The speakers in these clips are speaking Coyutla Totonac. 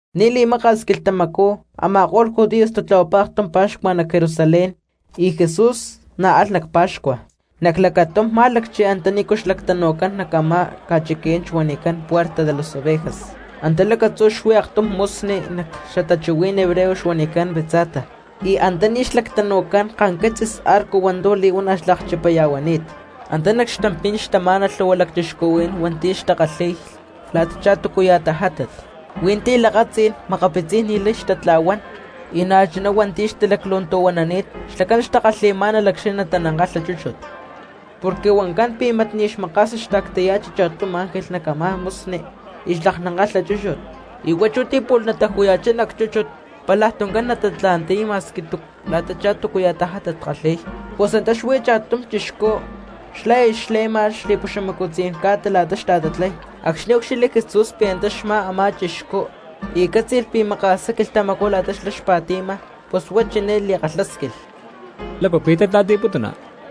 Ni̠ li̠maka̠s quilhtamacú a̠ma̠ko̠lh judíos tatlahuapá aktum pa̠xcua nac Jerusalén y Jesús na̠ alh nac pa̠xcua. Nac lacatum má̠lacchi antanícu xlactanu̠cán nac a̠má ca̠chiquí̠n xuanicán Puerta de las Ovejas, antá lacatzú xuí aktum musni nac xatachuhuí̠n hebreo xuanicán Betzata, y antaní xlactanu̠cán kanquitzis arco hua̠ntu̠ li̠huana̠ xlakchipaya̠huani̠t. Antá nac xtampí̠n xtamá̠nalh lhu̠hua cristianos hua̠nti̠ xtakalhi̠y la̠tachá túcuya̠ tajátat: hui̠nti̠ lakatzí̠n, makapitzí̠n ni̠lay xtatla̠huán y na̠chuná hua̠nti̠ xtalaclu̠ntu̠huanani̠t; xlacán xtakalhi̠má̠nalh acxni̠ natanankatla chúchut. Porque huancán pi̠ mat ni̠ xmaka̠sni xta̠ctaya̠chi cha̠tum ángel nac a̠má musni y xlaknankatla chúchut y huá chú ti̠ pu̠lh nataju̠ya̠chá nac chúchut pálaj tuncán natatla̠nti̠y ma̠squi la̠tachá túcuya̠ tajátat xkalhi̠y. Pus antá xuí cha̠tum chixcú xlá aya xle̠ma xli̠puxamacu̠tzayán ca̠ta la̠ta xta̠tatlay. Acxni̠ úcxilhli Jesús pi̠ antá xmá a̠má chixcú y cátzi̠lh pi̠ maka̠sá quilhtamacú la̠ta xlá xpa̠ti̠ma, pus huá chiné li̠kalhásquilh: —¿Lácu pi̠ tatla̠nti̠putuna?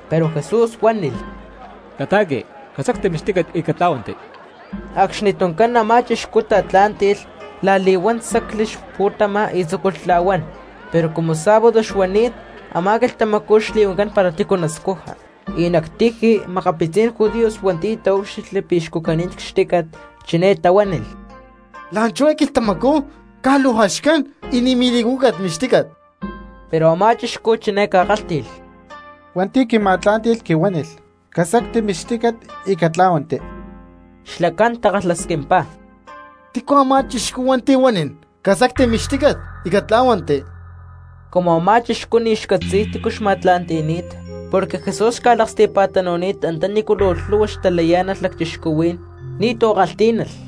Pero Jesús huánilh: —Cata̠qui, casacti mixtícat y catlá̠huanti. Acxni tuncán a̠má chixcú tatlá̠nti̠lh la̠li̠huán, sacli xpu̠tama y tzúculh tla̠huán. Pero cumu sábado xuani̠t a̠má quilhtamacú xli̠huancán para tícu nascuja, y nac tiji makapitzí̠n judíos hua̠nti̠ taúcxilhli pi̠ xcucani̠t cxtícat chiné tahuánilh: —La̠nchú eé quilhtamacú caj luu jaxcán y ni̠ mili̠cúcat mixtícat. Pero a̠má chixcú chiné ca̠kálhti̠lh: —Hua̠nti̠ quima̠tlá̠nti̠lh quihuánilh: “Casacti mixtícat y catlá̠huanti.” Xlacán takalhasquimpá: —¿Tícu a̠má chixcú hua̠nti̠ huanín: “Casacti mixtícat y catlá̠huanti”? Cumu a̠má chixcú ni̠ xcatzi̠y tícu xma̠tla̠nti̠ni̠t, porque Jesús xca̠laksti̠pa̠tanu̠ni̠t antanícu luu lhu̠hua xtalayá̠nalh cristianos, ni̠tu̠ kalhtí̠nalh.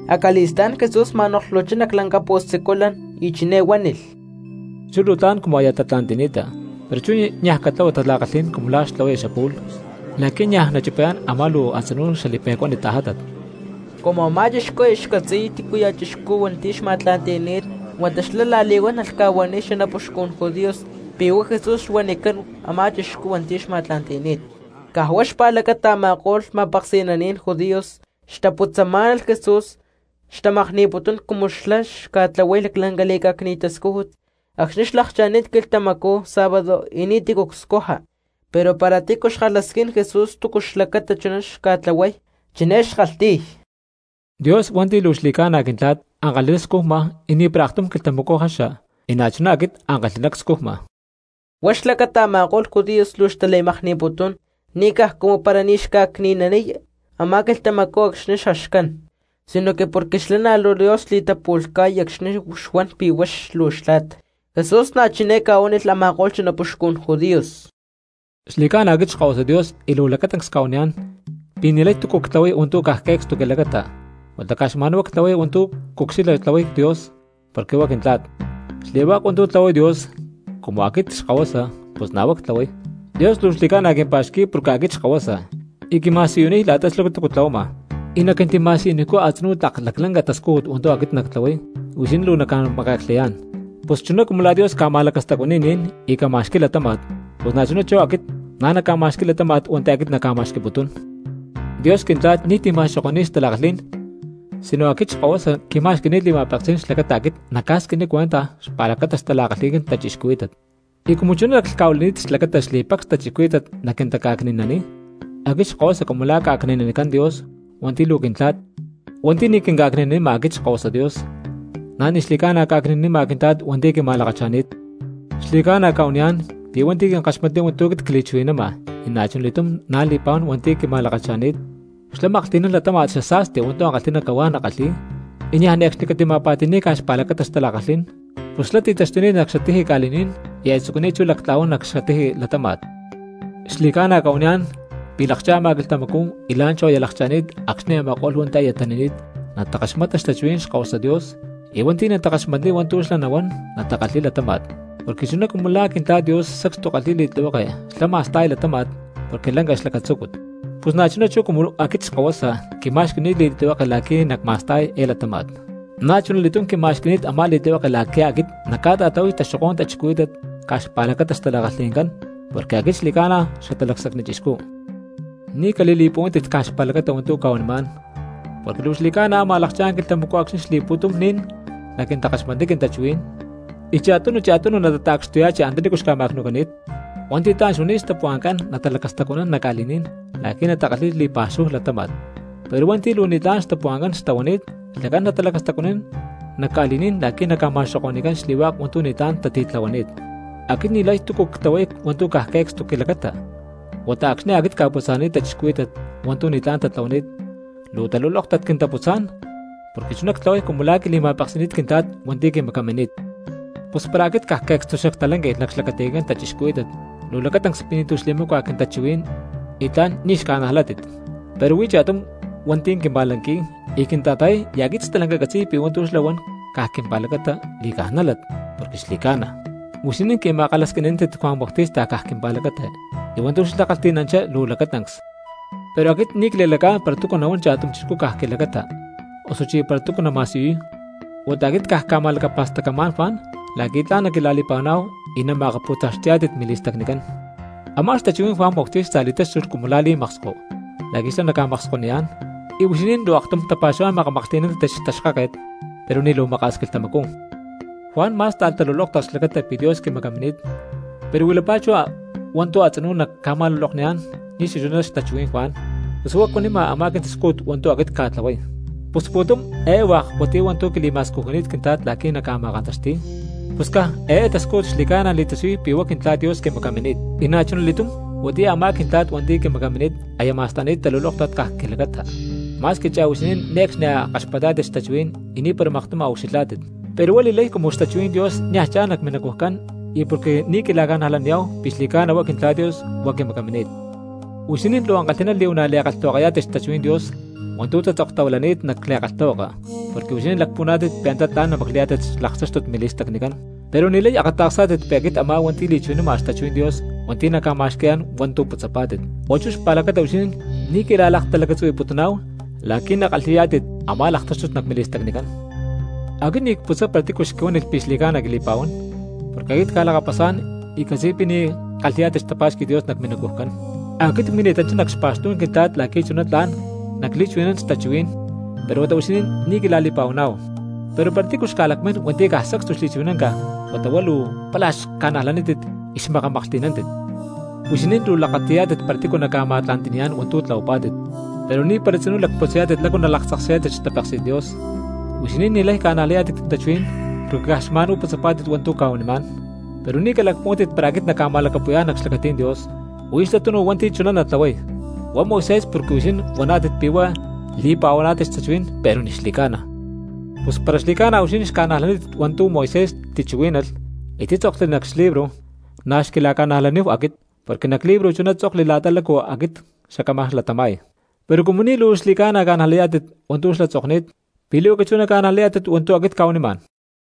Acali̠stá̠n Jesús ma̠noklhuchá nac lanca pu̠siculan y chiné huánilh: —Chú luu tla̠n cumu aya tatla̠nti̠ni̠ta, pero chú niaj catlahua tala̠kalhí̠n cumu la̠ xtlahuaya xapu̠lh la̠qui̠ niaj nachipayá̠n a̠má luu a̠tzinú xali̠pe̠cuánit tajátat. Cumu a̠má chixcú aya xcatzi̠y tícuya̠ chixcú hua̠nti̠ xma̠tla̠nti̠ni̠t huata xlá la̠li̠huán alh ca̠huaniy xanapuxcun judíos pi̠ huá Jesús xuanicán a̠má chixcú hua̠nti̠ xma̠tla̠nti̠ni̠t. Caj huá xpa̠lacata a̠ma̠ko̠lh ma̠peksi̠naní̠n judíos xtaputzamá̠nalh Jesús xtamakni̠putún cumu xlá xca̠tlahuay laclanca li̠cá̠cni̠t tascújut acxni̠ xlakcha̠ni̠t quilhtamacú sábado y ni̠tícu scuja. Pero para tícu xkalhasquín Jesús túcu xlacata chuná xtlahuay, chiné xkalhti̠y: —Dios hua̠nti̠ luu xli̠ca̠na Quintla̠t, ankalhi̠ná scujma y ni̠para aktum quilhtamacú jaxa, y na̠chuná chú aquit ankalhi̠ná cscujma. Huá xlacata a̠ma̠ko̠lh judíos luu xtali̠makni̠putún, ni̠ caj cumu para ni̠ xca̠cni̠naniy a̠má quilhtamacú acxni̠ jaxcán, sinoque porque xlá na̠ luu Dios xli̠tapu̠lhca̠y acxni̠ xuan pi̠ huá luu xtla̠t. Jesús na̠ chiné ca̠huánilh a̠ma̠ko̠lh xanapuxcun judíos: —Xli̠cána aquit Xkahuasa Dios y luu lacatancs cca̠huaniyá̠n pi̠ ni̠lay túcu ctlahuay hua̠ntu̠ caj que̠cstu quilacata, huata caj xma̠nhuá ctlahuay hua̠ntu̠ cucxilha tlahuay Dios porque huá quintla̠t. Xli̠hua̠k hua̠ntu̠ tlahuay Dios, cumu aquit Xkahuasa, pus na̠ huá ctlahuay. Dios luu xli̠ca̠na quimpa̠xqui̠y porque aquit Xkahuasa y quima̠siyuniy la̠ta túcu xlá tlahuama, y naquintima̠siyuniycú a̠tzinú tlak laclanca tascújut hua̠ntu̠ aquit nactlahuay y huixinín luu naca̠make̠klhayá̠n. Pus chuná cumu la̠ Dios ca̠ma̠lacastacuani̠y ni̠n y ca̠ma̠xqui̠y latáma̠t, pus na̠chuná chú aquit na̠ nacma̠xqui̠y latáma̠t hua̠nti̠ aquit nacma̠xqui̠putún. Dios quintla̠t ni̠ti̠ ma̠xoko̠ni̠y xtala̠kalhí̠n sino aquit Xkahuasa quima̠xqui̠ni̠t li̠ma̠peksí̠n xlacata aquit nacca̠squiniy cuentaj xpa̠lacata xtala̠kalhi̠ncán cristianos. Y cumu chuná laclhca̠huili̠ni̠t xlacata xli̠pacs cristianos naquintaca̠cni̠naniy aquit Xkahuasa cumu la̠ ca̠cni̠nanicán Dios hua̠nti̠ luu quintla̠t, hua̠nti̠ ni̠ quinca̠cni̠naniy aquit Xkahuasa Dios na̠ ni̠ xli̠ca̠na ca̠cni̠nanima quintla̠t hua̠nti̠ quima̠lakacha̠ni̠t. ’Xli̠ca̠na cca̠huaniyá̠n pi̠ hua̠nti̠ quinkaxmatniy hua̠ntu̠ cliakchuhui̠nama y na̠chuna li̠túm chú li̠pa̠huán hua̠nti̠ quima̠lakacha̠ni̠t, xlá maklhti̠nán latáma̠t xasa̠sti hua̠ntu̠ ankalhi̠ná cahuá nakalhi̠y, y niaj ne̠cxni catima̠pa̠ti̠ni̠ca xpa̠lacata xtala̠kalhí̠n, pus xlá ti̠taxtuni̠t nac xatiji ca̠li̠ní̠n y aya tzucuni̠t chú lactla̠huán nac xatiji latáma̠t. Xli̠ca̠na cca̠huaniyá̠n pi̠ lakcha̠ma quilhtamacú y la̠nchujá aya lakcha̠ni̠t acxni̠ a̠ma̠ko̠lh hua̠nti̠ aya tani̠ni̠t natakaxmata xtachuhuí̠n Xkahuasa Dios, y hua̠nti̠ natakaxmatniy hua̠ntu̠ xlá nahuán natakalhi̠y latáma̠t. Porque chuná cumu la̠ Quintla̠t Dios sacstu kalhi̠y li̠tlihueke xlá ma̠sta̠y látama̠t porque lanca xlacatzúcut, pus na̠chuná chú cumu aquit Xkahuasa quima̠xqui̠ni̠t li̠tlihueke la̠qui̠ nacma̠sta̠y eé latáma̠t. Na̠chunali̠túm quima̠xqui̠ni̠t a̠má li̠tlihueke la̠qui̠ aquit nacca̠ta̠tlahuay taxokó̠n cristianos caj xpa̠lacata xtala̠kalhi̠ncán, porque aquit xli̠ca̠na Xatalacsacni Chixcú. Ni̠ cali̠li̠puhuántit caj xpa̠lacata hua̠ntu̠ cca̠huanimá̠n, porque luu xli̠ca̠na ámaj lakchá̠n quilhtamacú acxni̠ xli̠pu̠tum ni̠n naquintakaxmatniy quintachuhuí̠n, y cha̠tunu cha̠tunu natata̠cxtuya̠chi antanícu xca̠ma̠cnu̠cani̠t. Hua̠nti̠ tla̠n xuani̠t xtapuhua̠ncán natalacastacuanán nac ca̠li̠ní̠n la̠qui̠ natakalhi̠y li̠pa̠xúhu latáma̠t, pero hua̠nti̠ luu ni̠tlá̠n xtapuhua̠ncán xtahuani̠t xlacán natalacastacuanán nac ca̠li̠ní̠n la̠qui̠ naca̠ma̠xoko̠ni̠cán xli̠hua̠k hua̠ntu̠ ni̠tlá̠n tatitlahuani̠t. ’Aquit ni̠lay túcu ctlahuay hua̠ntu̠ caj que̠cstu quilacata, huata acxni̠ aquit cca̠putza̠naniy cristianos hua̠ntu̠ ni̠tlá̠n tatlahuani̠t luu xtalulóktat quintaputzá̠n porque chuná ctlahuay cumu la̠ quili̠ma̠peksi̠ni̠t Quintla̠t hua̠nti̠ quimacamini̠t. Pus para aquit caj que̠cstu xactalánqui̠lh nac xlacatí̠n cristianos, luu lacatancs pi̠ ni̠tu̠ xli̠macua quintachuhuí̠n y tla̠n ni̠ xca̠najlátit. Pero huí cha̠tum hua̠nti̠ quima̠lanqui̠y y quinta̠ta̠yay y aquit stalanca ccatzi̠y pi̠ hua̠ntu̠ xlá huan caj quimpa̠lacata li̠ca̠nájlat porque xli̠ca̠na. Huixinín qui̠ma̠kalhasquini̠nántit Juan Bautista caj quimpa̠lacata y hua̠ntu̠ xlá kalhti̠nanchá luu lacatancs. Pero aquit ni̠ cli̠lacá̠n para túcu nahuán cha̠tum chixcú caj quilacata, osuchí para túcu nama̠siyuy; huata aquit caj cca̠ma̠lacapa̠stacamá̠n Juan la̠qui̠ tla̠n naquila̠li̠pa̠huaná̠hu y nama̠akapu̠taxti̠yá̠tit mili̠stacnicán. Amá xtachuhuí̠n Juan Bautista li̠táxtulh cumu la̠ li̠maksko la̠qui̠ xlá naca̠makskoniyá̠n, y huixinín luu aktum tapa̠xuhuá̠n makamaklhti̠nántit xtaxkáket, pero ni̠ luu maka̠s quilhtamacú. Juan má̠sta̠lh talulóktat xlacata pi̠ Dios quimacamini̠t pero huilapá chú hua̠ntu̠ a̠tzinú naca̠ma̠lulokniyá̠n ni̠ xachuná xtachuhuí̠n Juan, pus huá cuanima a̠má quintascújut hua̠ntu̠ aquit cca̠tlahuay. Pus pu̠tum eé hua̠k huatiyá hua̠ntu̠ quili̠ma̠scujuni̠t Quintla̠t la̠qui̠ nacma̠kantaxti̠y, pus caj eé tascújut xli̠ca̠na li̠tasiyuy pi̠ huá Quintla̠t Dios quimacamini̠t. Y na̠chuna li̠túm huatiyá a̠má Quintla̠t hua̠nti̠ quimacamini̠t aya ma̠sta̠ni̠t talulóktat caj quilacata, ma̠squi chá huixinín ne̠cxni a̠ kaxpatá̠tit xtachuhuí̠n y ni̠para maktum a̠ ucxilhá̠tit. Pero huá li̠lay cumu xtachuhuí̠n nia̠ cha̠n nac minacujcán, y porque ni̠ quila̠ca̠najlaniyá̠hu pi̠ xli̠ca̠na huá Quintla̠t Dios y huá quimacamini̠t. Huixinín luu ankalhi̠ná li̠huana̠ li̠kalhtahuakayá̠tit xtachuhuí̠n Dios hua̠ntu̠ tatzoktahuilani̠t nac li̠kalhtahuaka porque huixinín lacpuhuaná̠tit pi̠ antá tla̠n namaclayá̠tit xlaktáxtut mili̠stacnicán, pero ni̠lay akata̠ksá̠tit pi̠ aquit a̠má hua̠nti̠ li̠chuhui̠nama xtachuhuí̠n Dios hua̠nti̠ naca̠ma̠xqui̠yá̠n hua̠ntu̠ putzapá̠tit. Huá chú xpa̠lacata huixinín ni̠ quila̠laktalacatzuhui̠putuná̠hu la̠qui̠ nakalhi̠yá̠tit a̠má laktáxtut nac mili̠stacnicán. ’Aquit ni̠ cputzay para tícu xquihuánilh pi̠ xli̠ca̠na quili̠pa̠huán, porque aquit cca̠lakapasá̠n y ccatzi̠y pi̠ ni̠ kalhi̠yá̠tit xtapá̠xqui̠t Dios nac minacujcán. Aquit cmini̠tanchá nac xpa̠xtú̠n Quintla̠t la̠qui̠ chuná tla̠n nacli̠chuhui̠nán xtachuhuí̠n, pero huata huixinín ni̠ quila̠li̠pa̠huaná̠hu; pero para tícu xca̠lakmín hua̠nti̠ caj sacstu xli̠chuhui̠nánca huata huá luu pála xca̠najlanítit y xmakamaklhti̠nántit. Huixinín luu lakati̠yá̠tit para tícu naca̠ma̠tla̠nti̠niyá̠n hua̠ntu̠ tlahuapá̠tit, pero ni̠para tzinú lacputzayá̠tit lácu nalaktzaksayá̠tit xtapéksi̠t Dios. Huixinín ni̠lay ca̠najlayá̠tit quintachuhuí̠n porque caj luu xma̠nhuá putzapá̠tit hua̠ntu̠ cca̠huanimá̠n. Pero ni̠ calacpuhuántit para aquit nacca̠ma̠lacapu̠yá̠n nac xlacatí̠n Dios, huí xlá tunu hua̠nti̠ chuná natlahuay, huá Moisés porque huixinín huaná̠tit pi̠ huá li̠pa̠huaná̠tit xtachuhuí̠n pero ni̠ xli̠ca̠na. Pus para xli̠ca̠na huixinín xca̠najlátit hua̠ntu̠ Moisés tichuhuí̠nalh y títzokli nac xlibro, na̠ xquila̠ca̠najlaníhu aquit, porque nac xlibro chuná tzokli la̠ta lácu aquit xacámaj latama̠y. Pero cumu ni̠ luu xli̠ca̠na ca̠najlayá̠tit hua̠ntu̠ xlá tzokni̠t, ¿pi̠ li̠huaca chú naca̠najlayá̠tit hua̠ntu̠ aquit cca̠huanimá̠n?